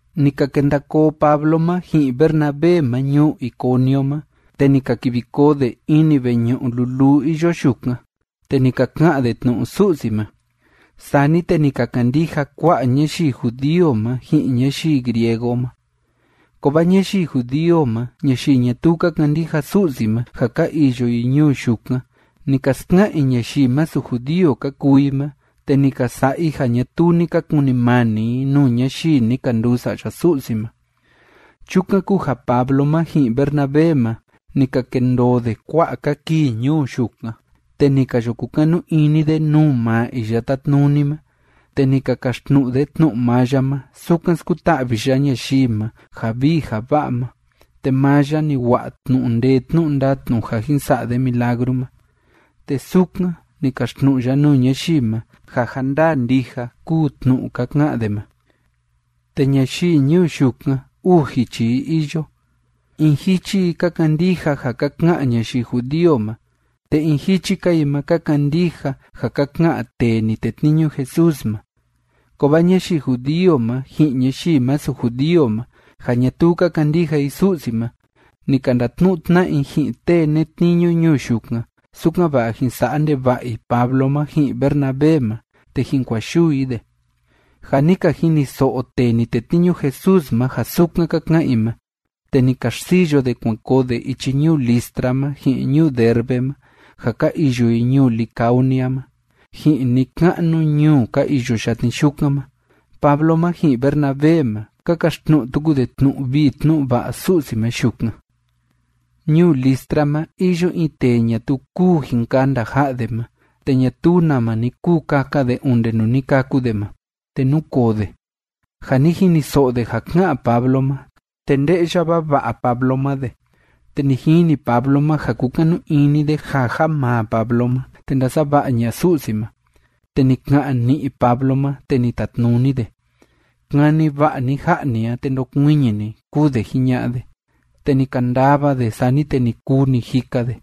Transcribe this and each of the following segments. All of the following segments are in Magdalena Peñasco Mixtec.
Ni ka kenda koo Pablo ma ji'in Bernabé ma ñuu Iconio ma, te ni ka kivi koo de ini veñu'u luluu iyo yukan, te ni ka ka'an de tnu'u Su'si ma. Sani te ni ka kandija kua'a ñayii judío ma ji'in ñayii griego ma. Kovaa ñayii judío ma ñayii ñatuu ka kandija Su'si ma ja ka iyo i ñuu yukan, ni ka ska'an i ñayii masu judío ka kuu i ma, te ni ka sa'a i ja ñatuu ni ka kunimani i nuu ñayii ni ka nduu sa'ya Su'si ma. Chukan kúu ja Pablo ma ji'in Bernabé ma, ni ka kendoo de kua'a‑ka kii ñuu yukan, te ni ka yo kukanu ini de nuu maa Iya Tátnuni ma, te ni ka kaxtnu'u de tnu'u maa ya ma sukan skuta'vi ya ñayii ma ja vii ja va'a ma, te maa ya ni wa'a tnu'u ndee tnu'u ndatnu ja jin sa'a de milagru ma, te sukan ni kaxtnu'u ya nuu ñayii ma ja ja ndaa ndija kúu tnu'u ka ka'an de ma. Te ñayii ñuu yukan, uu jichi i iyo. In jichi i ka kandija ja ka ka'an ñayii judío ma, te in jichi‑ka i ma ka kandija ja ka ka'an tee ni tetniñu Jesús ma. Kovaa ñayii judío ma ji'in ñayii masu judío ma ja ñatuu ka kandija i Su'si ma, ni ka ndatnu'u tna'a i ji'in tee netniñu ñuu yukan, sukan‑va'a jin sa'a ndeva'a i Pablo ma ji'in Bernabé ma te jin kua'a yuu i de. Ja ni ka jiniso'o tee ni tetniñu Jesús ma ja sukan ka ka'an i ma, te ni ka xsiyo de kuan koo de ichi ñuu Listra ma ji'in ñuu Derbe ma ja ka iyo i ñuu Licaonia ma, ji'in ni‑ka'nu ñuu ka iyo yatni yukan ma. Pablo ma ji'in Bernabé ma, ka kaxtnu'u tuku de tnu'u vii tnu'u va'a Su'si ma yukan. Ñuu Listra ma iyo in tee ñatuu kúu jin kanda ja'a de ma, te ñatuu nama ni kuu kaka de onde nuu ni kâku de ma. Te núkoo de. Ja ni jiniso'o de ja ká'an Pablo ma, te nde'ya vava'a Pablo ma de, te ni jini Pablo ma ja kúkanu ini de ja ja maa Pablo ma, te ndasava'a ña'a Su'si ma. Te ni ka'an ni'i Pablo ma, te ni tatnuni de: ―Kani va'a ni ja'a ni a, te ndokuiñi ni ―kúu de jiña'a de. Te ni kandava de, sani te ni kuu ni jika de.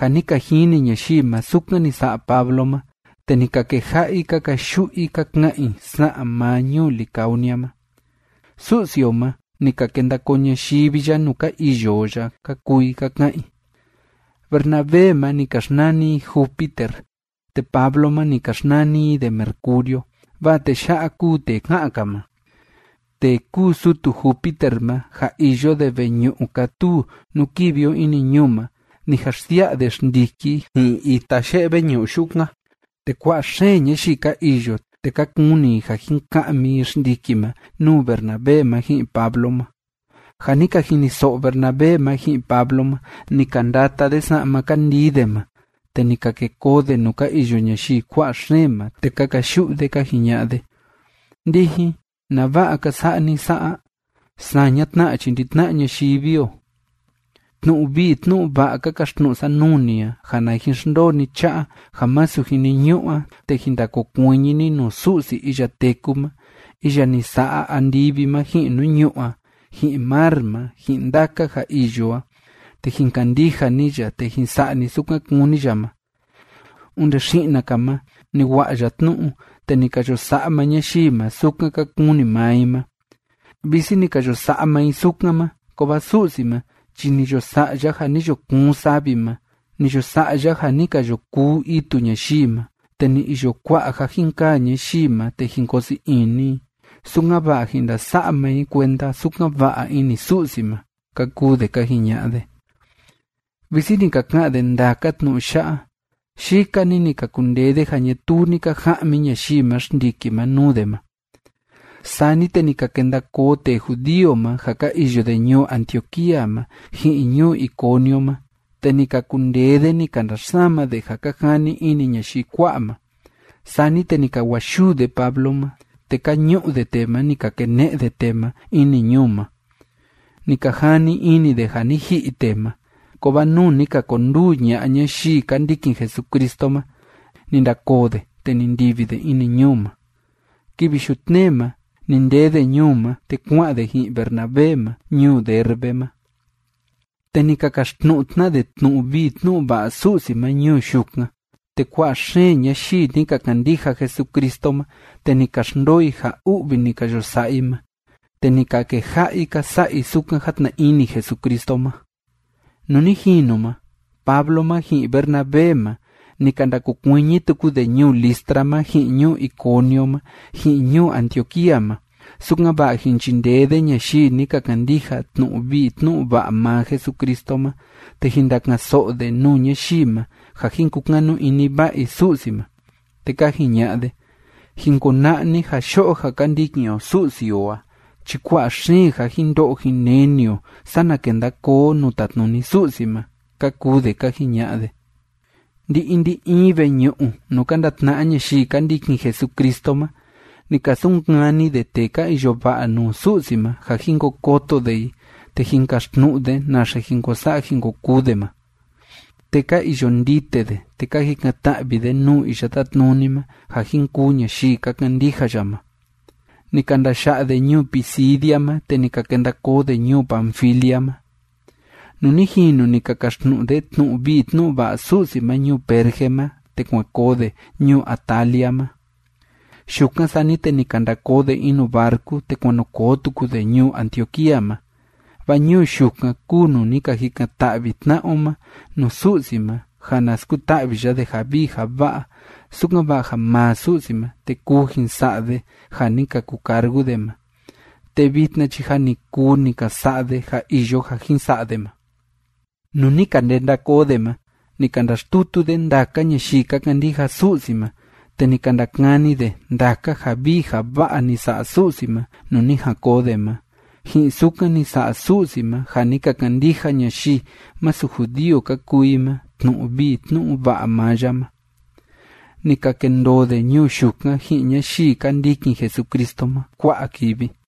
Ja ni ka jini ñayii ma sukan ni sa'a Pablo ma, te ni ka keja'a i ka kayu'u i ka ka'an i sa'an maa ñuu Licaonia ma: ―Su'si o ma, ni ka kenda koo ñayivi ya nuu ka iyo o ya ―ka kuu i ka ka'an i. Bernabé ma ni ka xnani i Júpiter, te Pablo ma, ni ka xnani i de Mercurio, vaa tee ya'a kúu tee ká'an‑ka ma. Tee kúu sutu Júpiter ma ja iyo de veñu'u kátuu nuu kivi o ini ñuu ma, ni jan xsia'a de xndiki ji'in ita ye'e veñu'u yukan, te kua'a xeen ñayii ka iyo, te ka kuni i ja jin ka'mi i xndiki ma nuu Bernabé ma ji'in Pablo ma. Ja ni ka jiniso'o Bernabé ma ji'in Pablo ma, ni ka ndata de sa'ma ka ndii de ma, te ni ka ke koo de nuu ka iyo ñayii kua'a xeen ma, te ka kayu'u de, ka jiña'a de: ―Ndijin, ¿nava'a ka sa'a ni sa'a? Saña tna chi ndi‑tna'a ñayivi o. Tnu'u vii tnu'u va'a ka kaxtnu'u sa nuu ni a, ja na jin xndoo ni cha'a ja masu jiniñu'u a, te jin ndakokuiñi ni nuu Su'si iya téku ma, iya ni sa'a andivi ma ji'in nuu ñu'ú a ji'in mar ma ji'in ndaka ja iyo a, te jin kandija ni ya, te jin sa'a ni sukan kúni ya ma. Onde xi'na‑ka ma ni wa'a ya tnu'u, te ni ka yo sa'a maa ñayii ma sukan ka kuni maa i ma. Visi ni ka yo sa'a maa i sukan ma, kovaa Su'si ma chi ni yo sa'a ya ja ni yo kuun savi ma, ni yo sa'a ya ja ni ka yo kuu itu ñayii ma, te ni iyo kua'a ja jin kaa ñayii ma te jin koo sii ini i, sukan‑va'a jin ndasa'a maa i kuenda sukan va'a ini Su'si ma ―ka kuu de ka jiña'a de. Visi ni ka ka'an de ndaka tnu'u ya'a, yika‑ni ni ka kundee de ja ñatuu ni ka ja'mi ñayii ma xndiki ma nuu de ma. Sani te ni ka kenda koo tee judío ma ja ka iyo de ñuu Antioquía ma ji'in ñuu Iconio ma, te ni ka kundee de ni ka ndaxsama de ja ka jani ini ñayii kua'a ma. Sani te ni ka wa'a yuu de Pablo ma, te ka ñu'u de tee ma, ni ka kene'e de tee ma ini ñuu ma. Ni ka jani ini de ja ni ji'i tee ma. Kovaa nuu ni ka konduu ña'a ñayii ka ndikin Jesucristo ma, ni ndakoo de, te ni ndivi de ini ñuu ma. Kivi yutnee ma ni ndee de ñuu ma, te kua'an de ji'in Bernabé ma ñuu Derbe ma. Te ni ka kaxtnu'u tna de tnu'u vii tnu'u va'a Su'si ma ñuu yukan, te kua'a xeen ñayii ni ka kandija Jesucristo ma, te ni ka xndoo i ja u'vi ni ka yo sa'a i ma, te ni ka keja'a i ka sa'a i sukan játna ini Jesucristo ma. Nuu ni jinu ma, Pablo ma ji'in Bernabé ma, ni ka ndakokuiñi tuku de ñuu Listra ma ji'in ñuu Iconio ma ji'in ñuu Antioquía ma, sukan‑va'a jin chindee de ñayii ni ka kandija tnu'u vii tnu'u va'a maa Jesucristo ma, te jin ndaka'an‑so'o de nuu ñayii ma ja jin kukanu ini va'a i Su'si ma. Te ka jiña'a de: ―Jin kona'a ni ja yo'o ja ka ndikin o Su'si o a chi kua'a xeen ja jin ndo'o jin neni o, sana kenda koo o nuu tatnuni Su'si ma ―ka kuu de ka jiña'a de. Ndi‑in ndi‑in veñu'u nuu ka ndatna'a ñayii ka ndikin Jesucristo ma ni ka sunkani de tee ka iyo va'a nuu Su'si ma ja jin ko koto de i te jin kaxtnu'u de naxe jin ko sa'a jin ko kuu de ma. Te ka iyo ndite de, te ka jikan‑ta'vi de nuu Iya Tátnuni ma ja jin kuu ñayii ka kandija ya ma. Ni ka ndaya'a de ñuu Pisidia ma, te ni ka kenda koo de ñuu Panfilia ma. Nuu ni jinu ni ka kaxtnu'u de tnu'u vii tnu'u va'a Su'si ma ñuu Perge ma, te kuan koo de ñuu Atalia ma. Yukan, sani te ni ka nda koo de in nuu barcu, te kuan nu koo tuku de ñuu Antioquía ma. Vaa ñuu yukan kúu nuu ni ka jikan‑ta'vi tna'a o ma nuu Su'si ma ja na skuta'vi ya de ja vii ja va'a, sukan‑va'a ja maa Su'si ma, te kuu jin sa'a de ja ni ka kucargu de ma, te vitna chi ja ni kuu ni ka sa'a de ja iyo ja jin sa'a de ma. Nuu ni ka ndenda koo de ma, ni ka ndaxtutu de ndaka ñayii ka kandija Su'si ma, te ni ka ndakani de ndaka ja vii ja va'a ni sa'a Su'si ma nuu ni jan koo de ma, ji'in sukan ni sa'a Su'si ma ja ni ka kandija ñayii masu judío ka kuu i ma tnu'u vii tnu'u va'a maa ya ma. Ni ka kendoo de ñuu yukan ji'in ñayii ka ndikin Jesucristo ma kua'a kivi.